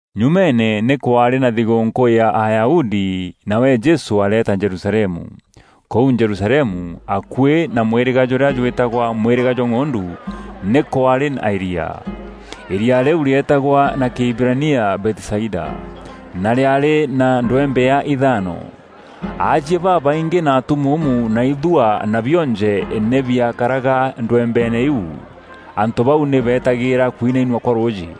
Nyumeene, nî kwaarî na thigûûnkû ya Ayahudi, nawe Jesû areeta Jerusalemu. Kûu Jerusalemu, akuî na mwîrîga jûrîa jwîtagwa Mwîrîga jwa ng'ondu, nî kwaarî na îriaa. Îriaa rîu rîeetagwa na Kîhibirania Bethisaida, na rîaarî na ndwembea ithaano. Aajie babaingî na atumuumu na ithua na bionje nî biakaraga ndwembeene iu. [Antû bau nî beetagîîra kwinainua kwa rûûjî.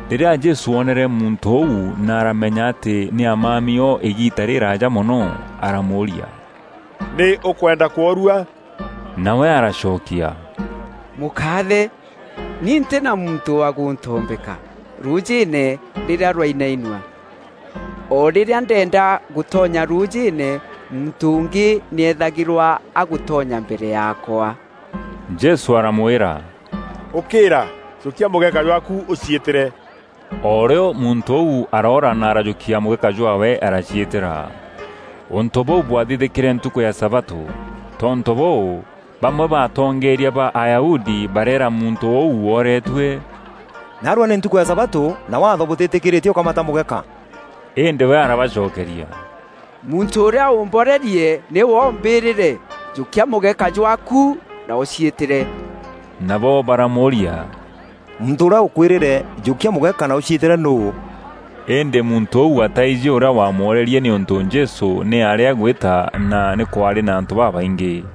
Rîrîa Jesû oonere muntû ûu na aramenya atî nî aamami o îgiita rîrîraaja mono, aramûûria, “Nî ûkwenda kworua?” Nawe aracokia, “Mûkaathe, ni ntî na muntû wa gûntombeka rûûjîîne rîrîa rwainainua. O rîrîa ndeenda gûtonya rûûjîîne muntû ûngî nî eethagîrwa agûtonya mbere yaakwa.” Jesû aramwîra, “Ûkîîra, jûkia mûgeka jwaaku ûciîtîre.” O rîo muntû ûu aroora na arajûkia mûgeka jwaawe araciîtîra. Ûntû bûu bwathithîkîre ntukû ya sabatû. Tontû bûû, bamwe ba atongeeria ba Ayahudi bareera muntû ûu wooretue, “Naarua nî ntukû ya sabatû na Waatho bûtîtîkîîrîtie ûkamata mûgeka.” Îndî we arabacokeria, “Muntû ûrîa ûmborerie nîwe ûmbîrîre, ‘Jûkia mûgeka jwaaku na ûciîtîre.’” Nabo baramûûria, “Muntû ûrîa ûkwîrîre, ‘Jûkia mûgeka na ûciîtîre nûû?’” Îndî muntû ûu ataijî ûrîa waamworerie nîûntû Jesû nî aarî agwîta na nî kwaarî na antû babaingî.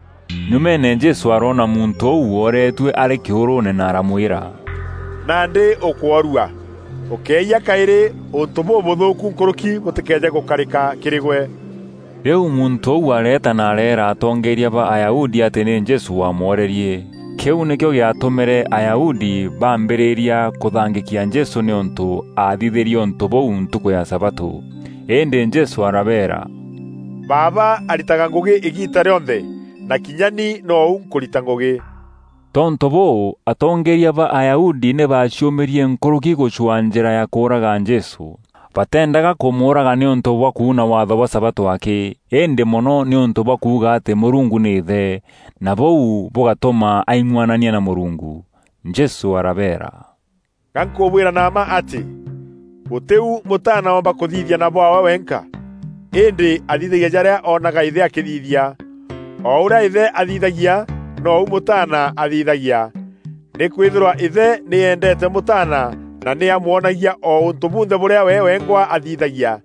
Nyumeene Jesû aroona muntû ûu wooretue arî kîûrûûne na aramwîra, “Nandî ûkworua; ûkéeyia kaîrî ûntû bûbûthûûku nkûrûki bûtîkeeje gûkarîka kîrî gwe.” Rîu muntû ûu areeta na areera atongeeria ba Ayahudi atî nî Jesû waamworerie. Kîu nîkîo gîatûmîre Ayahudi baambîrîria kûthangîkia Jesû nîûntû aathithîrie ûntû bûu ntukû ya sabatû. Îndî Jesû arabeera, “Baaba aritaga ngûgî îgiita rîonthe, na kinya ni nou nkûrita ngûgî.” Tontû bûû, atongeeria ba Ayahudi nî baaciûmîrie nkûrûki gûcwaa njîra ya kûûraga Jesû. Bateendaga kûmûûraga nîûntû bwa kuuna waatho bwa sabatû akî, îndî mono nîûntû bwa kuuga atî Mûrungu nî Îthe, na bûu bûgatûma aing'anania na Mûrungu. Jesû arabeera, “Ga nkûbwîra na mma atî, gûtî u Mûtaana oomba kûthithia na bwaawe wenka. Îndî athithagia jarîa oonaga Îthe akîthithia. O ûrîa Îthe athithagia, nou Mûtaana athithagia. Nîkwîthîrwa Îthe nî eendeete Mûtaana na nî amwonagia o ûntû bunthe bûrîa we wengwa athithagia.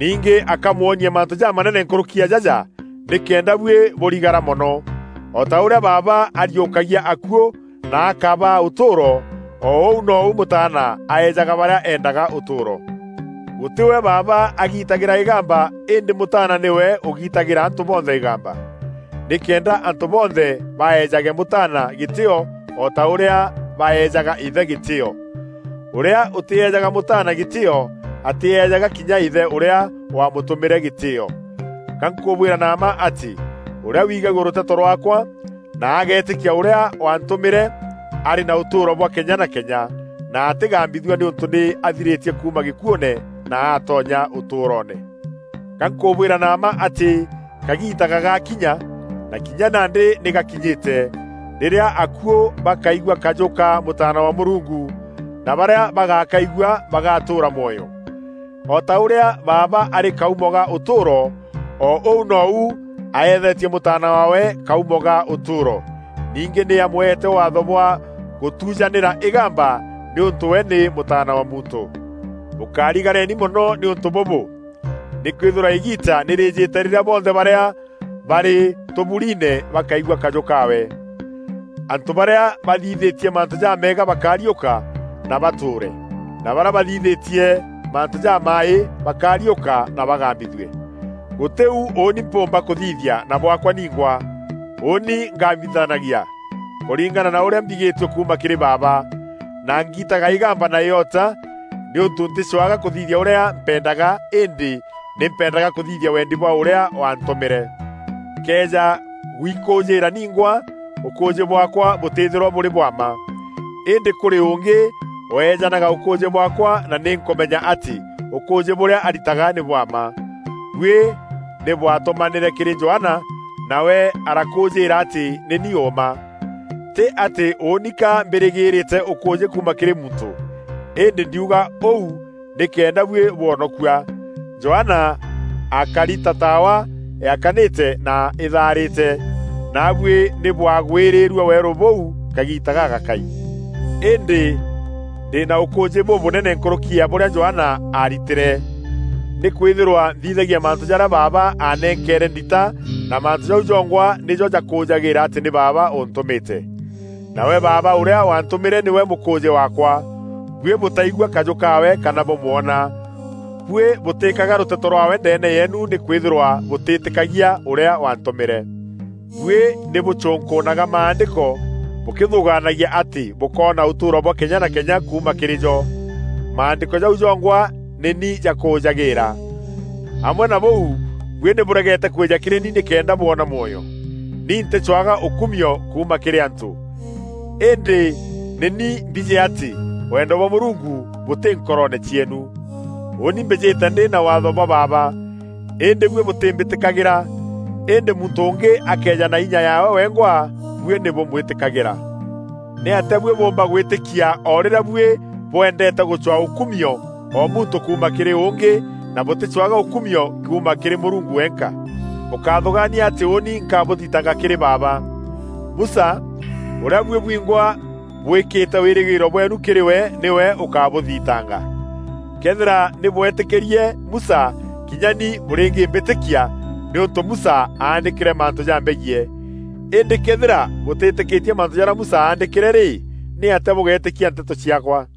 Ningî akamwonia mantû jamanene nkûrûki ya jaja nîkenda buî bûrigara mono. O ta ûrîa Baaba ariûkagia akuû na akabaa ûtûûro, o ûu nou Mûtaana aejaga barîa eendaga ûtûûro. Gûtî we Baaba agiitagîra îgamba îndî Mûtaana nîwe ûgiitagîra antû bonthe îgamba, nîkenda antû bonthe baejaga Mûtaana gîtîîo o ta ûrîa baejaga Îthe gîtîîo. Ûrîa ûtîejaga Mûtaana gîtîîo, atîejaga kinya Îthe ûrîa wamûtûmîre gîtîîo. “Ga nkûbwîra na mma atî, ûrîa wigagua rûteto rwaakwa, na ageetîkia ûrîa waantûmîre, arî na ûtûûro bwa kenya na kenya, na atîgambithua nîûntû nî athirîtie kuuma gîkuûne na aatonya ûtûûroone. Ga nkûbwîra na mma atî kagiita gagakinya, na kinya nandî nî gakinyîte, rîrîa akuû bakaigua kajû ka Mûtaana wa Mûrungu, na barîa bagakaigua bagatûûra mwoyo. O ta ûrîa Baaba arî kaumo ga ûtûûro, o ûu nou aethetie Mûtaana waawe kaumo ga ûtûûro. Ningî nî amweete waatho bwa gûtujanîra îgamba nîûntû we nî Mûtaana wa Muntû. Bûkarigareni mono nî ûntû bûbû; nîkwîthîrwa îgiita nî rîîjîte rîrîa bonthe barîa barî tûburiine bakaigua kajû kaawe, Antû barîa bathithîtie mantû jameega bakariûka na batûûre; na barîa bathithîtie mantû jamaaî bakariûka na bagambithue. “Gûtî u ûûni mpûûmba kûthithia na bwaakwa ningwa. Ûûni ngambithanagia kûringana na ûrîa mbigîtue kuuma kîrî Baaba, na ngiitaga îgamba na îota nîûntû ntîcwaga kûthithia ûrîa mpendaga îndî ni mpendaga kûthithia wendi bwa ûrîa waantûmîre. “Nkëeja gûikûûjîîra ningwa, ûkûûjî bwaakwa bûtîîthîrwa bûrî bwa mma. Îndî kûrî ûngî weejanaga ûkûûjî bwaakwa na nî nkûmenya atî ûkûûjî bûrîa aritaga nî bwa mma. Buî nî bwatûmanîre kîrî Johana, nawe arakûûjîîra atî nî ni ûûma. Tî atî ûûni ka mbîrîgîîrîte ûkûûjî kuuma kîrî muntû, îndî ndiuga ûu nîkenda buî bwonokua. Johana aakari ta taawa yaakanîte na îtharîte, naabuî nî bwagwîrîîrue weerû bûu kagiita gagakai. Îndî ndî na ûkûûjî bûbûnene nkûrûki ya bûrîa Johana aaritîre. Nîkwîthîrwa nthithagia mantû jarîa Baaba aanenkeere ndita na mantû jau jongwa nîjo jakûûjagîîra atî nî Baaba ûntûmîte. Nawe Baaba ûrîa waantûmîre nîwe mûkûûjî waakwa. Buî bûtaigua kajû kaawe kana bûmwona. Buî bûtîîkaga rûteto rwaawe ndeene yeenu nîkwîthîrwa bûtîîtîkagia ûrîa waantûmîre. Buî nî bûcûnkûûnaga Maandîko bûkîthûgaanagia atî bûkoona ûtûûro bwa kenya na kenya kuuma kîrî jo. Maandîko jau jongwa nî ni jakûûjagîîra. Amwe na bûu, buî nî bûregete kwîja kîrî ni nîkenda bwona mwoyo. “Ni ntîcwaga ûkumio kuuma kîrî antû. Îndî ni nî mbijî atî wendo bwa Mûrungu bûtî nkoroone cieenu. Ûûni mbîjîte ndî na Waatho bwa Baaba, îndî buî bûtîmbîtîkagîra. Îndî muntû ûngî akëeja na inya yaawe wengwa, buî nî bûmwîtîkagîra. Nîatîa buî bûûmba gwîtîkia o rîrîa buî bwendeete gûcwaa ûkumio o muntû kuuma kîrî ûngî, na bûtîcwaga ûkumio kuuma kîrî Mûrungu wenka? Bûkáthûgaania atî ûûni nkabûthitanga kîrî Baaba. Musa ûrîa buî bwingwa bwîkîte wîrîgîîro bweenu kîrî we nîwe ûkabûthitanga. Këethîra nî bwetîkîrie Musa, kînya ni bûrîngîmbîtîkia, nîûntû Musa aandîkîre mantû jambegiî. Îndî këethîra bûtîtîkîtie mantû jarîa Musa aandîkîre rî, nîatîa bûgeetîkia nteto ciaakwa?”